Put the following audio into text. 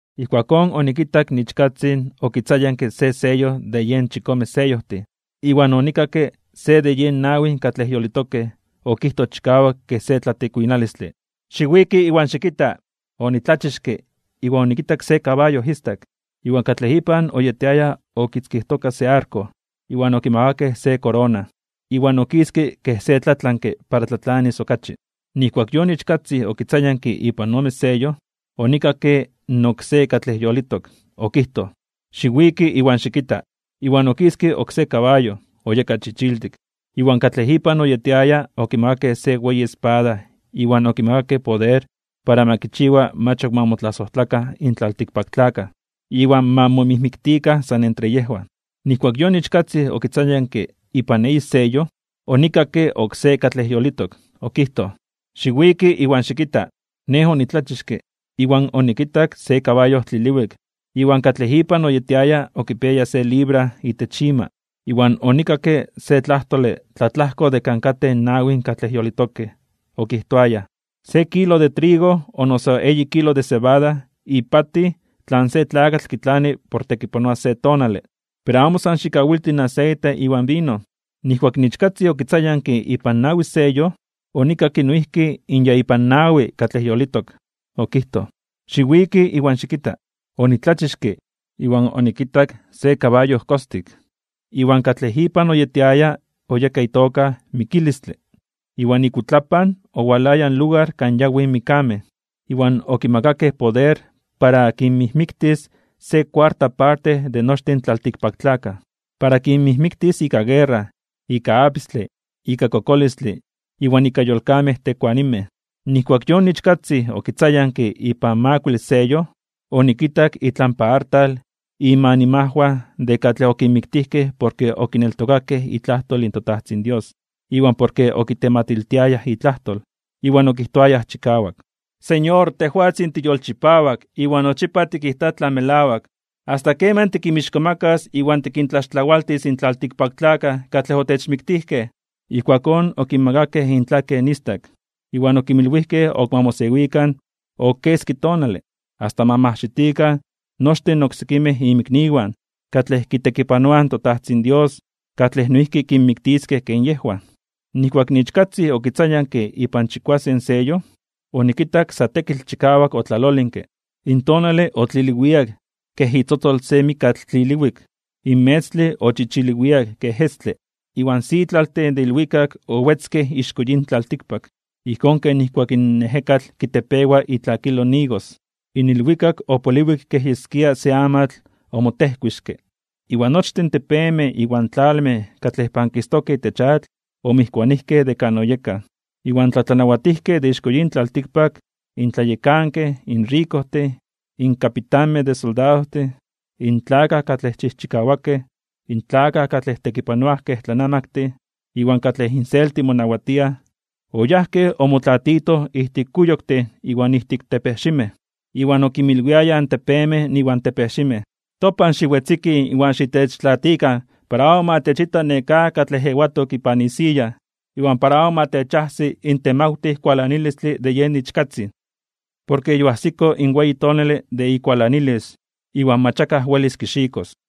Ijkuakón onikitak in Ichkatzin okitzayanke se seyo de yen chikome seyojtin, iwan onikakke se de yen nawi katlej yolitokej okijtoj chikawak kej se tlatikuinalistle: ―¡Xiwiki iwan xikita! Onitlachixke, iwan onikitak se kabayo istak, iwan katlej ipan oyetiaya okitzkijtoka se arko. Iwan okimakakej se korona, iwan okiske kej se tlatlanke para tlatlanis okachi. Nijkuak yon Ichkatzin okitzayanke ipan ome seyo, onikakke in oksé katlej yolitok, okijtoj: ―¡Xiwiki iwan xikita! Iwan okiske oksé kabayo, oyeka chichiltik, iwan katlej ipan oyetiaya okimakakej se weyi espada iwan okimakakej poder para ma kichiwa mach ok ma motlasojtlakan in tlaltikpaktlakaj iwan ma momijmiktikan san entre yejwan. Nijkuak yon Ichkatzin okitzayanke ipan eyi seyo, onikakke oksé katlej yolitok, okijtoj: ―¡Xiwiki iwan xikita! Nej onitlachixke, iwan onikitak se kabayo tliliwik, iwan katlej ipan oyetiaya okipiaya se libra (librajxikale) itech ima. Iwan onikakke se tlajtole tlatlajko de kan katej in nawin katlej yolitokej, okijtoayaj: ―Se kilo de trigo o noso eyi kilo de cebada ipatij tlan se tlakatl kitlani por tekipanoa se tonale. Pero amo san xikawilti in aseite iwan vino. Nijkuak in Ichkatzin okitzayanke ipan nawi seyo, onikakke noijki in ya ipan nawi katlej yolitok, okijtoj: ―¡Xiwiki iwan xikita! Onitlachixke, iwan onikitak se kabayo kostik, iwan katlej ipan oyetiaya oyeka itoka Mikilistle. Iwan ikuitlapan owalaya in lugar kan yawij mikkamej. Iwan okimakakej poder para kinmijmiktis se kuarta parte de nochtin in tlaltikpaktlakaj. Para kinmijmiktis ika guerra, ika apistle, ika kokolistle, iwan ika yolkamej tekuanimej. Nijkuak yon Ichkatzin okitzayanke ipan makuile seyo, onikitak itlampa artal inmanimajwan de katlej okinmiktijkej porke okineltokayaj itlajtol in toTajtzin Dios, iwan porke okitematiltiayaj itlajtol. Iwan okijtoayaj chikawak: ―Señor, tejwatzin tiyolchipawak iwan nochipa tikijta tlan melawak, ¿asta keman tikinmixkomakas (tikintzonmanas) iwan tikintlaxtlawaltis in tlaltikpaktlakaj katlej otechmiktijkej? Ijkuakón okinmakakej intlaken istak, iwan okinmilwijkej ok ma mosewikan ok keski tonale, asta ma majxitikan nochtin oksekimej inmikniwan katlej kitekipanoaj in toTajtzin Dios katlej noijki kinmiktiskej ken yejwan. Nijkuak in Ichkatzin okitzayanke ipan chikuasen seyo, onikitak sa tekitl chikawak otlalolinke. In tonale otliliwiak kej itzotzol se mikatl tliliwik, in metztle ochichiliwiak kej estle, iwan sitlaltin de ilwikak owetzkej ixko yin tlaltikpak, ijkón ken nijkuak in ejekatl kitepewa itlakilo in igos. In ilwikak opoliwik kej yeskia se amatl omotejkuixke, iwan nochtin in tepemej iwan tlalmej katlej pankistokej itech atl omijkuanijkej de kan oyekaj. Iwan in tlatlanawatijkej de ixko yin tlaltikpak, in tlayekankej, in rikojtin, in kapitanmej de soldadojtin, in tlakaj katlej chijchikawakej, in tlakaj katlej tekipanoaj kej tlanamaktin, iwan katlej inselti monawatiaj, oyajkej omotlatitoj ijtik kuyoktin iwan ijtik tepejximej. Iwan okinmilwiayaj in tepemej iwan tepejximej: ―Topan xiwetzikij, iwan xitechtlaatikan para amo ma techita nekáj katlej ewatok ipan isiya, iwan para amo ma techajsi in temawtij kualanilistle de yen Ichkatzin. Porke yoajsiko in weyi tonale de ikualanilis, iwan mach akaj welis kixikos.